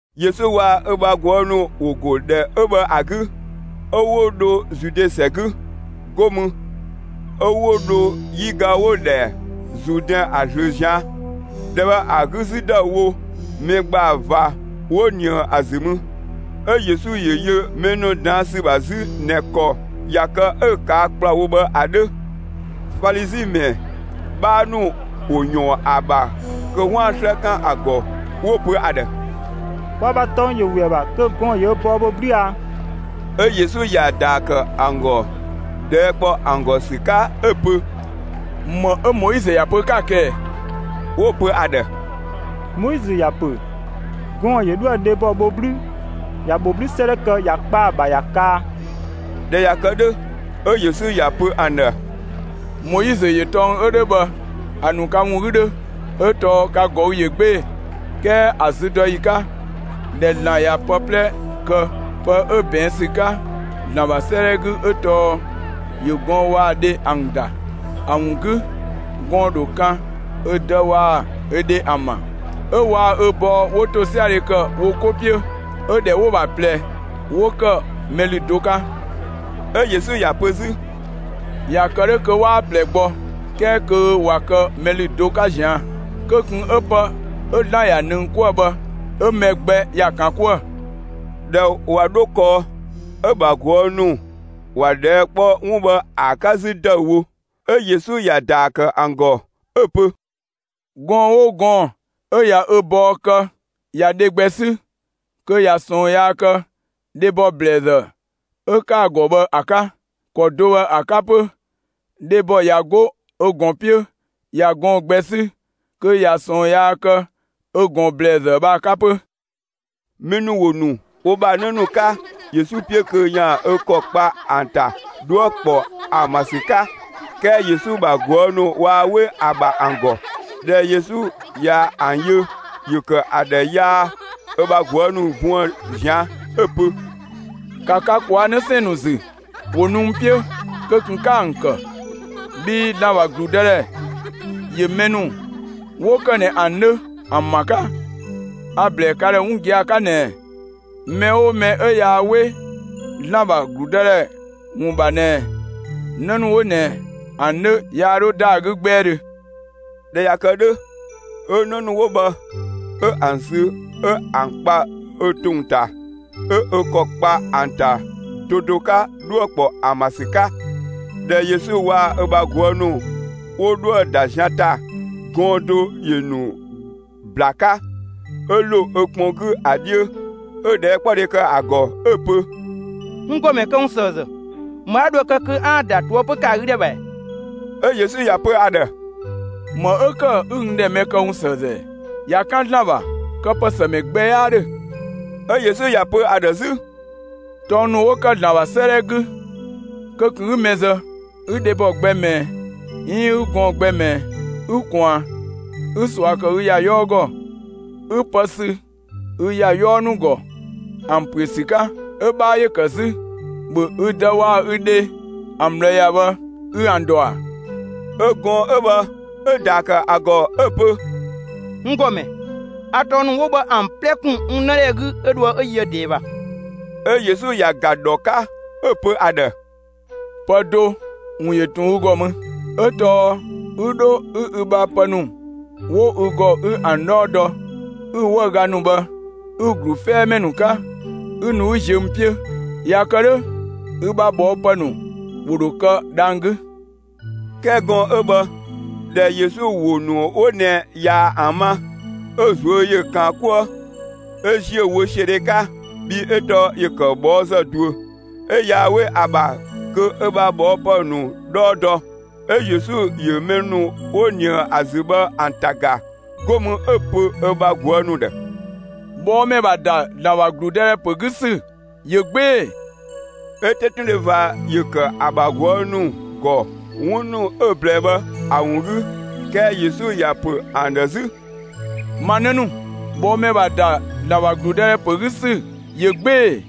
Yesu waa‑ ö bha ꞊guë' ‑nu ‑wo ‑go ‑dhɛ 'ö bhë ‑a 'gü, 'ö 'wo dho Zude ‑sɛ 'gü. 'Go mü 'ö 'wo dho 'yiga 'wo‑ ‑dhɛ Zuudɛn ‑a ꞊zlöö ꞊zian'. ‑Dhɛ bhë ‑a 'gü 'zü ‑dëüwo, mɛ ‑gbaa ꞊va 'wo ꞊nië ‑a ‑zü mü. 'Ö Yesu ‑yö yö mɛ ‑nu ꞊daan' ‑sü ‑bha 'zü ꞊nɛ ‑kɔ ꞊ya kë 'ö‑ ꞊kaa' ‑kplawo bhë ‑a 'dhö. Falizi ‑mɛ 'bhaa ‑nu ‑wo ‑yɔɔn ‑a ‑bha kö 'waan‑ 'slë 'kan ‑a ‑gɔ, 'wo‑ pö ‑a ‑dhë: «Kwa ‑bha tɔng ‑yö ‑we ‑a ‑bha kö gɔɔn‑ ‑yö ö bɔɔ bho 'blü a?» 'Ö Yesu ‑ya ‑daa ‑kë ‑an ‑gɔ ꞊dhɛɛ' ‑kpɔ ‑an ‑gɔ ‑sü 'ka 'ö‑ pö: «‑Më 'ö Moizö ‑ya pö 'ka‑ kë ꞊ɛ?» 'Wo‑ pö ‑a ‑dhë: «Moizö ‑ya ‑pö gɔɔn‑ ‑yö 'dhoë‑ dhebɔ bho 'blü ‑ya ‑bho 'blü 'sëëdhɛ kë ‑ya kpa ‑a ‑bha ‑ya kaa.» ꞊Dhɛ ꞊ya kë 'dhö, 'ö Yesu ‑ya pö ‑an ‑dhë: «Moizö ‑yö tɔng 'ö 'dhö bhë ‑a ‑nu ka ‑wun 'gü 'dhö 'ö tɔɔ ka ꞊gɔü' ꞊yö 'gbee‑. 'Kɛɛ ‑a züdɔyi 'ka ꞊dhɛ ‑Zlan ꞊ya pë 'plɛ ‑kë, pë 'ö ꞊bɛɛn' ‑sü 'ka ‑Zlan ‑bha 'sëëdhɛ 'gü 'ö tɔɔ ‑yö gɔɔn‑ waa‑ dhe ‑an ‑da. ‑A ‑wun 'gü gɔɔn‑ ‑dho kan ö dë waa‑ ö dhe ‑an ‑bha, 'ö waa‑ ö bɔɔ 'wo ‑tosiadhe ‑kë wo 'ko 'piö, 'Ö ‑dhɛ 'wo‑ ‑bha ꞊plɛ 'wo ‑kë mɛ ‑lü do 'ka.» 'Ö Yesu ‑ya pö 'zü: «꞊Ya kë 'dhö kö 'waa ꞊plɛ gbɔ, 'kɛɛ kö ꞊wa kë mɛ ‑lü do 'ka ꞊zian'. Kö ꞊kun 'ö pë 'ö ‑Zlan ꞊yaa‑ ꞊nëng 'kuë‑ bhë 'ö‑ mɛ gbɛ ‑ya ‑kan 'kuë‑!» ꞊Dhɛ ꞊wa 'dho kɔɔ, 'ö‑ ‑bha ꞊guë' ‑nu ‑wa ꞊dhɛɛ' kpɔ 'wun bhë ‑a 'ka 'zü ‑dëüwo. 'Ö Yesu ‑ya ‑daa ‑kë ‑an ‑gɔ 'ö‑ pö: «Gɔɔn‑ 'oo gɔɔn‑ 'ö ꞊ya ö bɔɔ kë ꞊ya dhebɔ gbɛ 'sü, kö ꞊ya ꞊sɔɔn yaa kë dhebɔ ‑blɛɛzë 'ö‑ ‑kë ‑a ‑gɔ bhë ‑a 'ka. ‑Kɔ do bhë ‑a 'ka 'pö, dhebɔ ꞊ya 'go ö ꞊gɔn 'piö ꞊ya gɔɔn‑ gbɛ 'sü, kö ꞊ya ꞊sɔɔn yaa kë ö ‑gɔn ‑blɛɛzë bhë ‑a 'ka 'pö.» Mɛ ‑nu ‑wo ‑nu wo ‑bha 'në ‑nu 'ka Yesu 'piö kö ‑yaan ö ‑kɔ kpa ‑an ‑ta 'dhuë‑ ‑kpɔ ‑an ‑bha ‑sü 'ka, 'kɛɛ Yesu ‑bha ꞊guë' ‑nu waa 'we ‑a ‑bha ‑an ‑gɔ. ꞊Dhɛ Yesu ꞊ya ‑an yö, ‑yö ‑kë ‑a ‑dhë yaa ö bha ꞊guë' ‑nu buën‑ ꞊zian' 'ö‑ pö: «‑Ka ka ꞊kwaa' 'në 'sɛɛn‑ ‑nu ‑zü ‑wo nu n 'piö, kö ꞊kun 'ka ‑an ‑kë! Bhii ‑Zlan ‑bha ‑gludëdhɛ ‑yö mɛ ‑nu 'wo ‑kë ꞊nɛ ‑an 'dhö ‑an ‑bha 'ka. A‑ ‑blɛɛ ka ‑dhë 'wun gia‑ 'ka ꞊nɛɛ: Mɛ 'oo mɛ 'ö yaa 'we ‑Zlan ‑bha ‑gludëdhɛ ‑wun ‑bha ꞊nɛ 'në ‑nu 'wo ꞊nɛ ‑an 'dhö, yaa 'dho ‑da ‑a 'gü 'gbɛɛdhö.» ꞊Dhɛ ꞊ya kë 'dhö, 'ö 'në ‑nu 'wo bhë, 'ö ‑an ‑sü 'ö ‑an kpa ö ‑tong ‑ta 'ö ö ‑kɔ kpa ‑an ‑ta do do 'ka 'dhuë‑ ‑kpɔ ‑an ‑bha ‑sü 'ka. ꞊Dhɛ Yesu waa‑ ö bha ꞊guë' ‑nu 'wo dhoë‑ ‑da zian ‑ta, gɔɔn‑ do ‑yö ‑nu ‑bla 'ka, 'ö ‑lo ö kpɔn 'gü ‑a 'dhiö, 'ö ꞊dhɛɛkpɔdhe ‑kë ‑a ‑gɔ 'ö‑ pö: «N ‑gɔmɛ këwunsëëzë, ‑më 'a dho ‑a kë kö 'aan‑ ‑da ꞊toëpö ‑kë ‑a 'gü ‑dhɛ ‑bha ‑ɛ?» 'Ö Yesu ‑ya pö ‑a ‑dhë: «‑Më 'ö ‑kë 'ü n ‑dhɛ mɛ këwunsëëzë ‑ɛ? ꞊Ya 'kan ‑Zlan ‑bha, këpësëmɛ gbɛ 'yaa ‑dhö.» 'Ö Yesu ‑ya pö ‑a ‑dhë 'zü: «Tɔng ‑nu 'wo ‑kë ‑Zlan ‑bha 'sëëdhɛ 'gü: Kö ꞊kun 'ü mɛ zë, 'ü dhebɔ gbɛ ꞊mɛɛ 'iin 'ü gɔɔn‑ gbɛ ꞊mɛɛ, 'ü ꞊kwaan, 'ü ꞊sua ‑kë ü ‑ya 'yɔɔ ‑gɔ, 'ü pë sü ü ‑ya 'yɔɔ ‑nu ‑gɔ ‑an ‑püö ‑sü 'ka; 'ö‑ 'bhaa ‑yö ‑kë 'zü ‑bhö ü dë waa‑ ü dhe ‑an ꞊bhlë ‑ya bhë 'ü ‑an ‑dɔ ‑a?» 'Ö gɔɔn‑ 'ö bhë 'ö‑ ‑daa ‑kë ‑a ‑gɔ 'ö‑ pö: «N ‑gɔmɛ, a tɔng ‑nu 'wo bhë ‑an 'plɛ ‑kun n 'nëdhɛ 'gü 'ö dhoë 'ö yöë ꞊dɛɛ ‑bha.» 'Ö Yesu ‑ya ‑ga ‑dhɔ 'ka, 'ö‑ pö ‑a ‑dhë: «Pë do ‑wun ‑yö ꞊tun ü ‑gɔ mü, 'ö tɔɔ 'ü 'dho 'ü ü bha pë ‑nu 'wo ü ‑gɔ 'ü ‑an 'dhɔɔ dɔ, 'ü‑ 'wëüga ‑nu bhë 'ü‑ ‑glu 'fɛɛmɛ ‑nu 'ka, 'ü nu 'ü ziö n 'piö! ꞊Ya kë 'dhö, ü bha ꞊bhɔɔpë ‑nu ‑wo ‑dho kë dhang‑ 'gü!» 'Kɛɛ gɔɔn‑ 'ö bhë ꞊dhɛ Yesu ‑wo ‑nu 'wo ꞊nɛ ꞊ya ‑an ma, 'ö‑ ꞊zuö' ‑yö ꞊kaan 'kuë, 'ö ‑ziö wösiödhe 'ka, bhii 'ö tɔɔ ‑yö ‑kë ꞊bhɔɔzë ꞊duö. 'Ö yaa 'we ‑a ‑bha kö ö ‑bha ꞊bhɔɔpë ‑nu 'dhɔɔ dɔ. 'Ö Yesu ‑yö mɛ ‑nu 'wo ꞊nië ‑a ‑zü bhë ‑an ‑ta ‑ga. 'Go mü 'ö‑ pö ö bha ꞊guë' ‑nu ‑dhë: «꞊Bhɔɔmɛ ‑bha ‑da ‑Zlan ‑bha ‑gludëdhɛ ‑pö 'gü ‑sü ꞊yö 'gbee‑!» 'Ö 'tetundhe ꞊va ‑yö ‑kë ‑a ‑bha ꞊guë' ‑nu ‑gɔ 'wun ‑nu 'ö‑ ꞊blɛɛ bhë ‑a ‑wun 'gü. 'Kɛɛ Yesu ‑ya ‑pö ‑an ‑dhë 'zü: «Ma 'në ‑nu, ꞊bhɔɔmɛ ‑bha ‑da ‑Zlan ‑bha ‑gludëdhɛ ‑pö 'gü ‑sü ꞊yö 'gbee‑!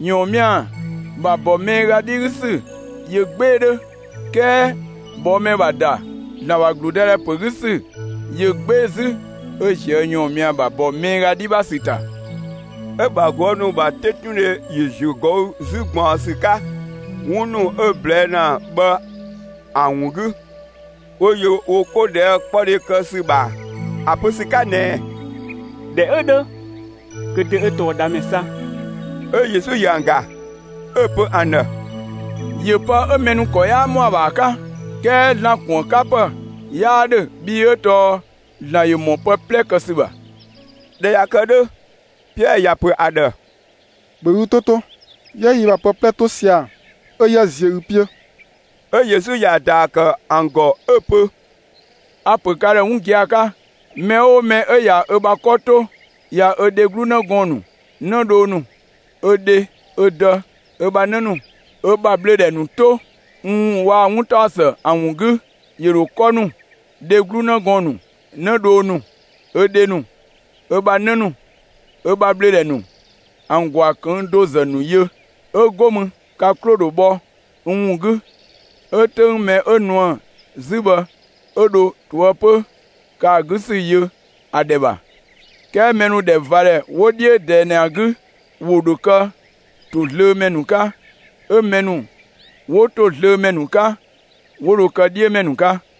‑Yɔɔnmia ‑bha ‑bɔ miiga 'dhi 'gü ‑sü ꞊yö 'gbee‑ 'dhö, 'kɛɛ ꞊bhɔɔmɛ ‑bha ‑da ‑Zlan ‑bha ‑gludëdhɛ ‑pö 'gü ‑sü ꞊yö 'gbee‑ 'zü 'ö ꞊zië' ‑yɔɔnmia ‑bha ‑bɔ miiga 'dhi ‑bha ‑sü ‑ta.» 'Ö‑ ‑bha ꞊guë' ‑nu ‑bha 'tetundhe ‑yö ‑ziö ꞊gɔü' 'zü ꞊gbaɔnsü 'ka, 'wun ‑nu 'ö‑ ꞊blɛɛ' ‑na bhë ‑an ‑wun 'gü, 'wo yö wo 'ko ꞊dhɛɛkpɔdhe kë ‑sü ‑bha ‑a pö ‑sü 'ka ꞊nɛɛ: «꞊Dhɛ 'ö 'dhö kö dö 'ö tɔɔ dhamɛ 'sa?» 'Ö Yesu ‑yö ‑an ‑ga, 'ö‑ pö ‑an ‑dhë: «‑Yö pë 'ö mɛ ‑nu ‑kɔ 'yaa ‑mɔ ‑a ‑bha ‑a 'ka, 'kɛɛ ‑Zlan ‑kuënkapë 'yaa 'dhö, bhii 'ö tɔɔ ‑Zlan ‑yö ‑mɔ pë 'plɛ kë ‑sü ‑bha.» ꞊Dhɛ ꞊ya kë 'dhö, Piɛɛ ‑ya ‑pö ‑a ‑dhë: «‑Bhö ü 'to 'to, 'yië yi ‑bha pë 'plɛ 'to sia‑, 'ö 'yië ziö ü 'piö!» 'Ö Yesu ‑ya ‑daa ‑kë ‑an ‑gɔ 'ö‑ pö: «A‑ ‑pö ka ‑dhë 'wun gia‑ 'ka mɛ 'oo mɛ ꞊ya ö bha 'kɔ 'to, ꞊ya ö dheglu 'në gɔɔn‑ ‑nu, 'nëdhoo ‑nu, ö dhe, ö dë, ö bha 'në ‑nu, ö ‑bha ꞊bhlöödhɛ ‑nu 'to n ‑wun waa‑ 'wuntaɔsë ‑an ‑wun 'gü, ‑yö ‑dho 'kɔ ‑nu, dheglu 'në gɔɔn‑ ‑nu, 'nëdhoo ‑nu, ö dhe ‑nu, ö bha 'në ‑nu, ö ‑bha ꞊bhlöödhɛ ‑nu, ‑an ‑gwaa ꞊këng' do ‑zë ‑nu yö. 'Ö 'go mü ka 'klo‑ dho bhɔ n ‑wun 'gü, 'ö 'töng mɛ 'ö nuë‑ 'zü bhë, 'ö dho ꞊toëpö ‑kë ‑a 'gü ‑sü yö ‑a ‑dhɛ ‑bha. 'Kɛɛ mɛ ‑nu ‑dhɛ ꞊va ‑dhɛ 'wo 'dhiö ꞊dɛɛ ꞊nɛ ‑a 'gü, ‑wo ‑dho kë ‑tozlöömɛ ‑nu 'ka, 'ö mɛ ‑nu 'wo ‑tozlöömɛ ‑nu 'ka, 'wo dho kë 'dhiömɛ ‑nu 'ka.»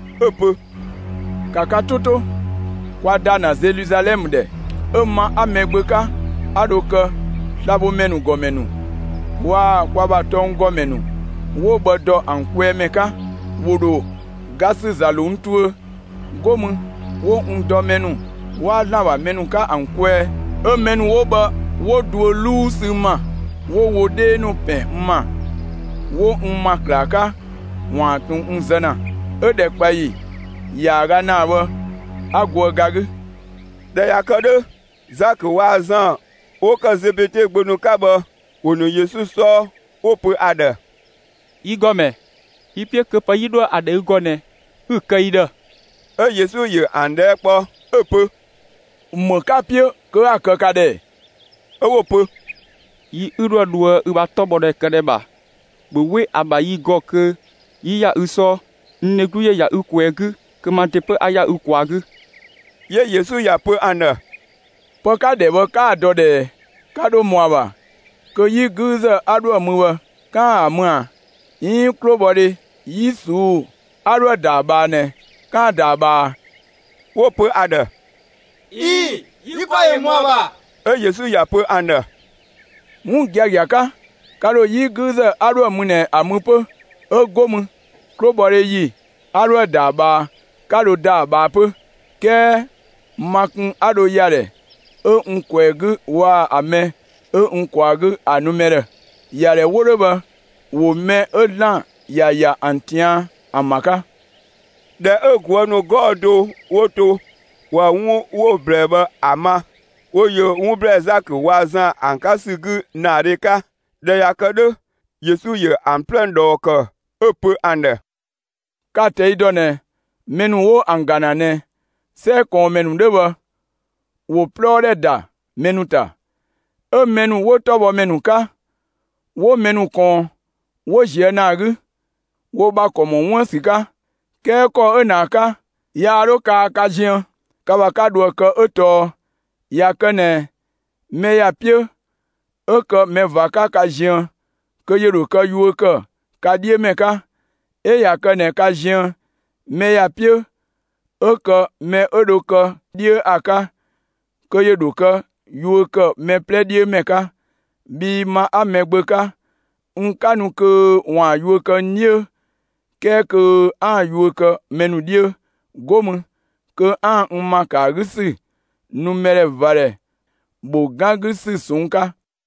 'ö‑ pö: «‑Ka ka 'to 'to! Kwa ‑da ‑na Zeluzalɛmë ‑dhɛ, 'ö ma 'a Mɛgbö 'ka, 'a dho kë slabhomɛ ‑gɔmɛ ‑nu, waa‑ kwa ‑bha tɔnggɔmɛ ‑nu 'wo bhë ‑dɔ ‑an kwɛɛ ‑mɛ 'ka, ‑wo ‑dho ga ‑sü ‑za ‑lo n tuö, 'go mü 'wo n dɔ mɛ ‑nu 'waa ‑Zlan ‑bha mɛ 'ka ‑an kwɛɛ. 'Ö mɛ ‑nu 'wo bhë 'wo duö 'luu sü n ‑ma, 'wo wo 'dhee ‑nu ‑pɛn n ‑ma, 'wo n ‑ma ‑klaa 'ka, ‑waan ꞊tun n zë ‑na, 'ö‑ ‑dhɛkpaɔyi ‑yaaga ‑naa bhë 'a goë ga 'gü.» ꞊Dhɛ ꞊ya kë 'dhö, Zakö waa‑ Zan 'wo ‑kë Zebede gbö ‑nu 'ka bhë, 'wo nu Yesu 'sɔɔ, 'wo‑ pö ‑a ‑dhë: «Yi ‑Gɔmɛ, yi‑ 'piö kö pë 'yi dhoë‑ ‑a ‑dhɛ ü ‑gɔ ꞊nɛ, 'ü‑ kë yi ‑dhë.» 'Ö Yesu ‑yö ‑an ꞊dhɛɛ' kpɔ 'ö‑ pö: «‑Më 'ka‑ 'piö kö 'a‑ kë ka ‑dhë ‑ɛ?» 'Ö 'wo‑ pö: «Yi 'ü 'dhoë‑ dhoë ü ‑bha 'tɔbhɔdhɛ këdhɛ ‑bha, ‑bhö 'we ‑a ‑bha yi ‑gɔ kö 'yi ‑ya ü 'sɔɔ. N dheglu ‑yö ‑ya ü ꞊kwɛɛ‑ 'gü, kö ma ‑de 'pö 'a ‑ya ü ꞊kwaa‑ 'gü.» 'Yö Yesu ‑ya ‑pö ‑an ‑dhë: «Pë 'ka‑ ‑dhɛ bhë, 'kaa‑ dɔ ꞊dhɛɛ! Ka ‑dho ‑mɔ ‑a ‑bha kö 'yi 'güüzë 'a 'dhoë‑ mü bhë, 'kaan‑ ‑a mü ꞊a, 'iin 'klobhɔdhe 'yi ꞊suu'‑ 'a 'dhoë‑ ‑da ‑a ꞊bhaa ꞊nɛ, 'kaan‑ ‑da ‑a ꞊bhaa ꞊a?» 'Wo‑ pö ‑a ‑dhë: «꞊Ii‑, yi ‑kɔ ‑yö ‑mɔ ‑a ‑bha.» 'Ö Yesu ‑ya pö ‑an ‑dhë: «'Wun giagia 'ka, ka ‑dho 'yi 'güüzë 'a 'dhoë‑ mü ꞊nɛ ‑a mü 'pö, 'ö 'go mü, 'klobhɔdhe ‑yi 'a 'dhoë‑ ‑da ‑a ꞊bhaa, ka ‑dho ‑da ‑a ꞊bhaa 'pö. 'Kɛɛ ma kun 'a dho ‑ya ‑dhɛ 'ö n ꞊kwɛɛ‑ 'gü waa‑ ‑a mɛ 'ö n ꞊kwaa‑ 'gü, ‑a nu mɛ ‑dhë; ‑yadhɛ 'wo 'dhö bhë, ‑wo mɛ 'ö ‑Zlan ‑ya ‑ya ‑an ꞊tian' ‑an ‑bha 'ka.» ꞊Dhɛ 'ö ꞊guë' ‑nu 'gɔɔ‑ do 'wo to ꞊wa 'wun 'wo‑ ꞊blɛɛ bhë ‑a ma, 'wo yö 'wun ‑blɛɛ Zakö waa‑ Zan ‑an 'ka ‑sü 'gü ‑naadhe 'ka. ꞊Dhɛ ꞊ya kë 'dhö, Yesu ‑yö ‑an 'plɛ ꞊dhɔɔ ‑kë, 'ö‑ pö ‑an ‑dhë: «Ka‑ ꞊tɛi' ‑dɔ ꞊nɛ, mɛ ‑nu 'wo ‑an ‑ga ‑na ꞊nɛ, 'sɛ ꞊kɔɔnmɛ ‑nu 'dhö bhë, ‑wo 'plɔɔ ‑dhɛ ‑da mɛ ‑nu ‑ta. 'Ö mɛ ‑nu 'wo 'tɔbhɔmɛ ‑nu 'ka, 'wo mɛ ‑nu ꞊kɔɔn 'wo ꞊zië' ‑naa 'gü, wo ‑bha ‑kɔ ‑mɔ 'wun ‑bha ‑sü 'ka. 'Kɛɛ ‑kɔ 'ö ꞊nɛ ‑a 'ka, yaa 'dho kaa ka ziën, ka ‑bha 'ka dho ‑a kë 'ö tɔɔ ꞊ya kë ꞊nɛ mɛ ‑ya 'piö 'ö kë mɛ ꞊va 'ka ka ziën, kö ‑yö ‑dho kë yuö ‑kë ka 'dhiö ‑mɛ 'ka. 'Ö ꞊ya kë ꞊nɛ ka ziën mɛ ‑ya 'piö 'ö kë mɛ 'ö dho kë 'dhiö ‑a 'ka, kö ‑yö ‑dho kë yuö ‑kë mɛ 'plɛ 'dhiö ‑mɛ 'ka. Bhii ma 'a Mɛgbö 'ka, n 'ka nu kö ‑waan yuö kë n 'dhiö, 'kɛɛ kö 'aan‑ yuö kë mɛ ‑nu 'dhiö, 'go mü kö 'aan‑ n ‑ma ‑kë ‑a 'gü ‑sü nu mɛdhɛvadhɛ ‑bho 'gan 'gü ‑sü ꞊sɔnng' 'ka.»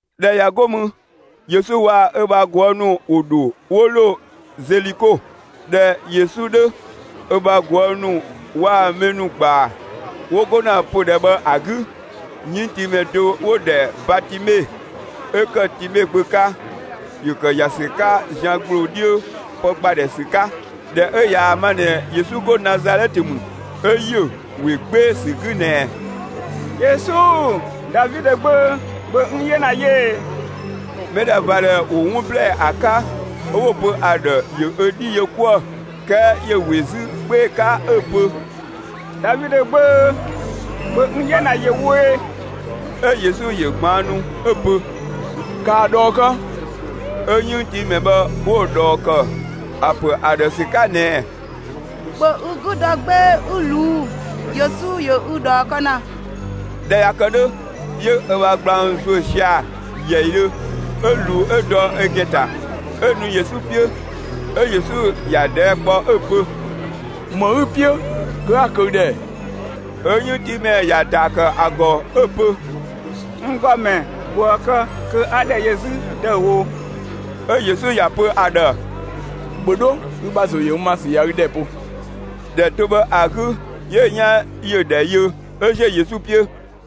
꞊Dhɛ ꞊ya 'go mü Yesu waa‑ ö ‑bha ꞊guë' ‑nu ‑wo ‑dho 'wo ‑lo Zeliko. ꞊Dhɛ Yesu 'dhö ö bha ꞊guë' ‑nu waa‑ mɛ ‑nu ‑gbaa 'wo go ‑na pödhɛ bhë ‑a 'gü, 'yënngtiimɛ do 'wo‑ ‑dhɛ Batimɛɛ, 'ö ‑kë Time gbö 'ka, ‑yö ‑kë ‑ya ‑sü 'ka zian ‑gbloo 'dhiö pë ‑gba ‑dhɛ ‑sü 'ka. ꞊Dhɛ 'ö ꞊yaa‑ ma ꞊nɛ Yesu 'go Nazalɛtë ‑mü, 'ö ‑yö ‑we 'gbee‑ 'sü 'gü ꞊nɛɛ: «Yesu, Davidö gbö, ‑bhö n 'yena yö ꞊ee!» Mɛdhɛvadhɛ ‑wo 'wun ꞊blɛɛ ‑a 'ka, 'ö 'wo‑ pö ‑a ‑dhë ‑yö ö 'dhi yö 'kuë‑; 'kɛɛ ‑yö ‑we 'zü 'gbee‑ 'ka 'ö‑ pö: «Davidö gbö, ‑bhö n 'yena ‑yö wo ꞊e!» 'Ö Yesu ‑yö ꞊gbaannu 'ö‑ pö: «‑Ka ‑a ꞊dhɔɔ ‑kë!» 'Ö 'yënngtiimɛ bhë 'wo‑ ꞊dhɔɔ ‑kë ‑a ‑pö ‑a ‑dhë ‑sü 'ka ꞊nɛɛ: «‑Bhö ü 'gü dɔ 'gbee‑ 'ü ꞊luu'‑! Yesu ‑yö ü ꞊dhɔɔ kë ‑na.» ꞊Dhɛ ꞊ya kë 'dhö, 'yö ö ‑bha gblang ‑zuö sia‑ ‑yɛidhö, 'ö ꞊luu 'ö dɔ ö ‑gɛn ‑ta, 'ö nu Yesu 'piö. 'Ö Yesu ‑ya ꞊dhɛɛ' kpɔ 'ö‑ pö: «‑Më 'ü‑ 'piö kö 'a‑ kë ü ‑dhë ‑ɛ?» 'Ö 'yënngtiimɛ ‑ya ‑daa ‑kë ‑a ‑gɔ 'ö‑ pö: «N ‑Gɔmɛ, ‑bhö ‑a kë kö 'a ‑dhɛ yö 'zü ‑dëüwo!» 'Ö Yesu ‑ya pö ‑a ‑dhë: «‑Bhö 'dho! Ü ‑bha ‑zo ‑yö n ‑ma ‑sü ꞊ya ü ‑dhɛ bo.» ‑Dhɛ do bhë ‑a 'gü 'yö‑ 'yan ‑yö ‑dhɛ yö, 'ö ‑ziö Yesu 'piö.